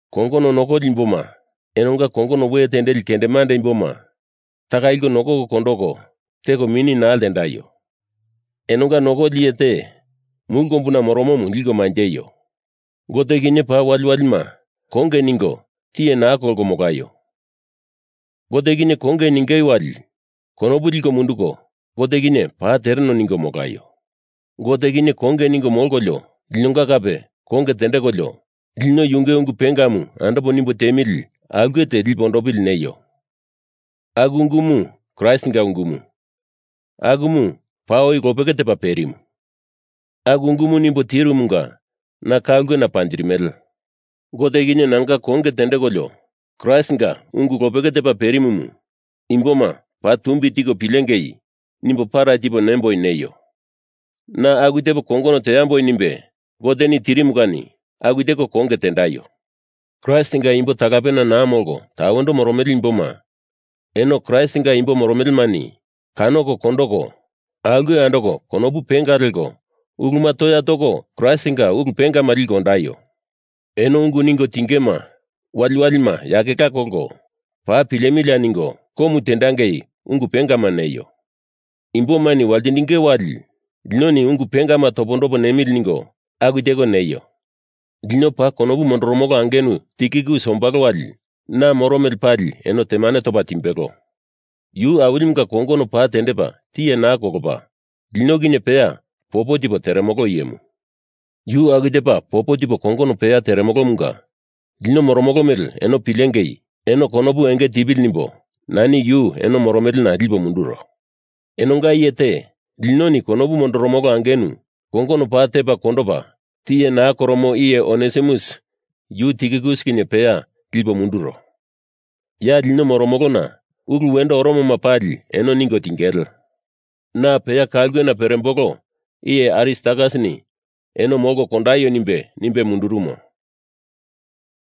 Kongono nokoli imboma, enonga kongono we tendeli kendemande imboma taka liko nokoko kondoko, teko mini naa ltendaio. Enonga Nokoli Iye te mulu kombuna moromomu liko manjeio. Gote kinye paa waliwalima konge ningo tiye naa kolko molaio. Gote kinye konge ningei wali konopu liko munduko Gote kinye paa tereno ningo molaio. Gote kinye konge ningo molkolio linonga kape konge tendekolio, lino yunge ungu pengamu andopo nimbo tiemili aulke te lipe ondopili neio. Aku ungumu Kraistinga ungumu, akumu paa oi lopeke tepa perimu. Aku ungumu nimbo tirumunga na ka ulkena panjirimele. Gote kinye nanga konge tendekolio Kraistinga ungu lopeke tepa perimumu imboma paa tumbi tiko pilengei nimbo para tipo nemboi neio. Na aku tepo kongono teamboi nimbe Goteni tirimu kani aku teko konge tendaio. Kraistinga imbo talapena naa molko tawendo moromele imboma eno Kraistinga imbo moromelemani kanoko kondoko aulke andoko konopu penga leko uluma toya toko Kraistinga ulu pengama liko ondaio. Eno ungu ningo tingema waliwalima yakela kolko paa pilemilia ningo komu tendengei ungu pengama neio. Imbomani waltindinge wali linoni ungu pengama topondopo nemili ningo aku teko neio. Lino paa konopu mondoromolo angenu Tikikus ombalo wali na moro mele pali eno temane topa timbelo. Yu Awilimunga kongono paa tendepa tiye naa kolopa, lino kinye peya popo tipo teremolo iyemu. Yu aku tepa popo tipo kongono peya teremolomunga lino moromolo mele eno pilengei, eno konopu enge tipili nimbo nani yu eno moromelena lipo munduro. Enonga iye te, linoni konopu mondoromolo angenu kongono paa tepa kondopa tiye naa koromo iye Onesimus yu Tikikus kinye peya lipo munduro. Ya lino moromolona ulu wendo oromoma pali eno ningo tingele. Na peya ka ulkena perembolo iye Aristarkasini eno molko kondaio nimbe, nimbe mundurumo.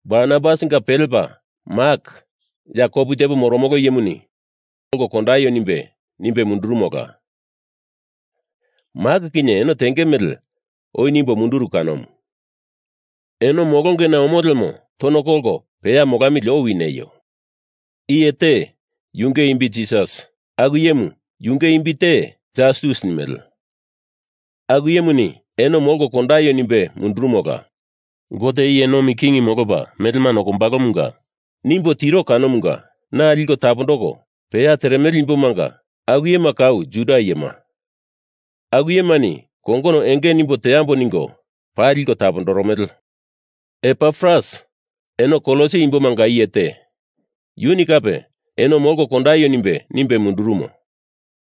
Barnabasinga pelepa Mak ya kopu tepo moromolo iyemuni eno molko kondaio nimbe, nimbe mundurumola. Mak kinye eno tenge mele oi nimbo munduru kanomu. Eno molongena omo lemo tono kolko peya molamili owi neio. Iye te, yunge imbi Jisas, aku iyemu yunge imbi te Jastus nimele, aku iyemuni eno molko kondaio nimbe mundurumola. Gote iye nomi king molopa melema nokombalomunga nimbo tiro kongonomu na liko tapondoko peya teremele imbomanga aku iyema kau Juda iyema. Aku iyemani kongono enge nimbo teambo ningo paa liko tapondoromele. Epafras, eno Kolosi imbomanga iye te, yuni kape eno molko kondaio nimbe, nimbe mundurumo.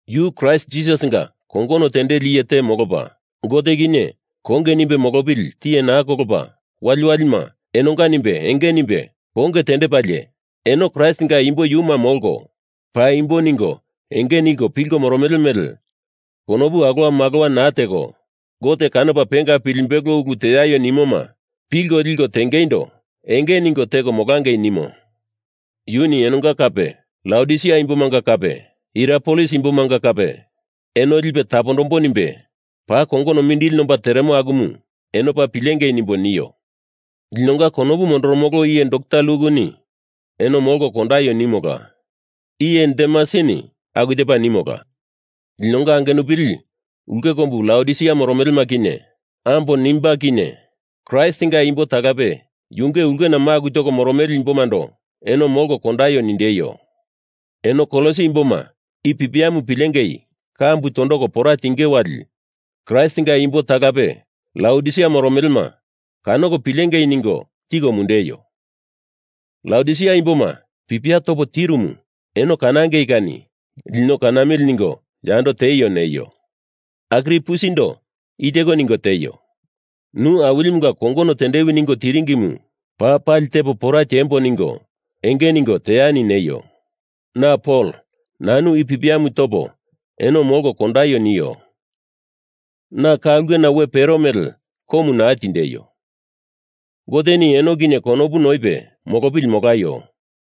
Yu Kraist Jisasinga kongono tendeli iye te molopa, Gote kinye konge nimbe molopili tiye naa kolopa waliwalima enonga nimbe enge nimbe konge tendepalie eno Kraistinga imbo yuma molko, paimbo ningo enge ningo pilko moromele mele konopu alowa malowa naa teko Gote kanopa penga pilimbelo ulu teaio nimoma pilko liko tengeindo enge ningo teko molangei nimo. Yuni enonga kape, Laodisia imbomanga kape Hierapolis imbomanga kape, eno lipo tapondambo nimbe paa kongono mindili nomba teremo akumu eno paa pilengei nimbo nio. Linonga konopu mondoromolo iye dokta Lukuni eno molko kondaio nimola. Iye Demasini aku tepa nimola. Linonga angenupili ulke kombu Laodisia moromelema kinye ambo Nimba kinye Kraistinga imbo talape yunge ulkena maku toko moromele imbomando eno molko kondaio nindeio. Eno Kolosi imboma i pipiamu pilengei kambu tondoko pora tinge wali Kraistinga imbo talape Laodisia moromelema kanoko pilengei ningo tiko mundeio. Laodisia imboma pipia topo tirumu eno kanangei kani lino kanamili ningo yando tieio neio. Arkipusindo i teko ningo tieio. Nu Awilimunga kongono tendewi ningo tiringimu paa pali tepo pora tiembo ningo enge ningo teani neio. Na Pol nanu i pipiamu topo eno molko kondaio nio. Na ka ulkena we pero mele komu naa tindeio. Goteni eno kinye konopu noipe molopili molaio.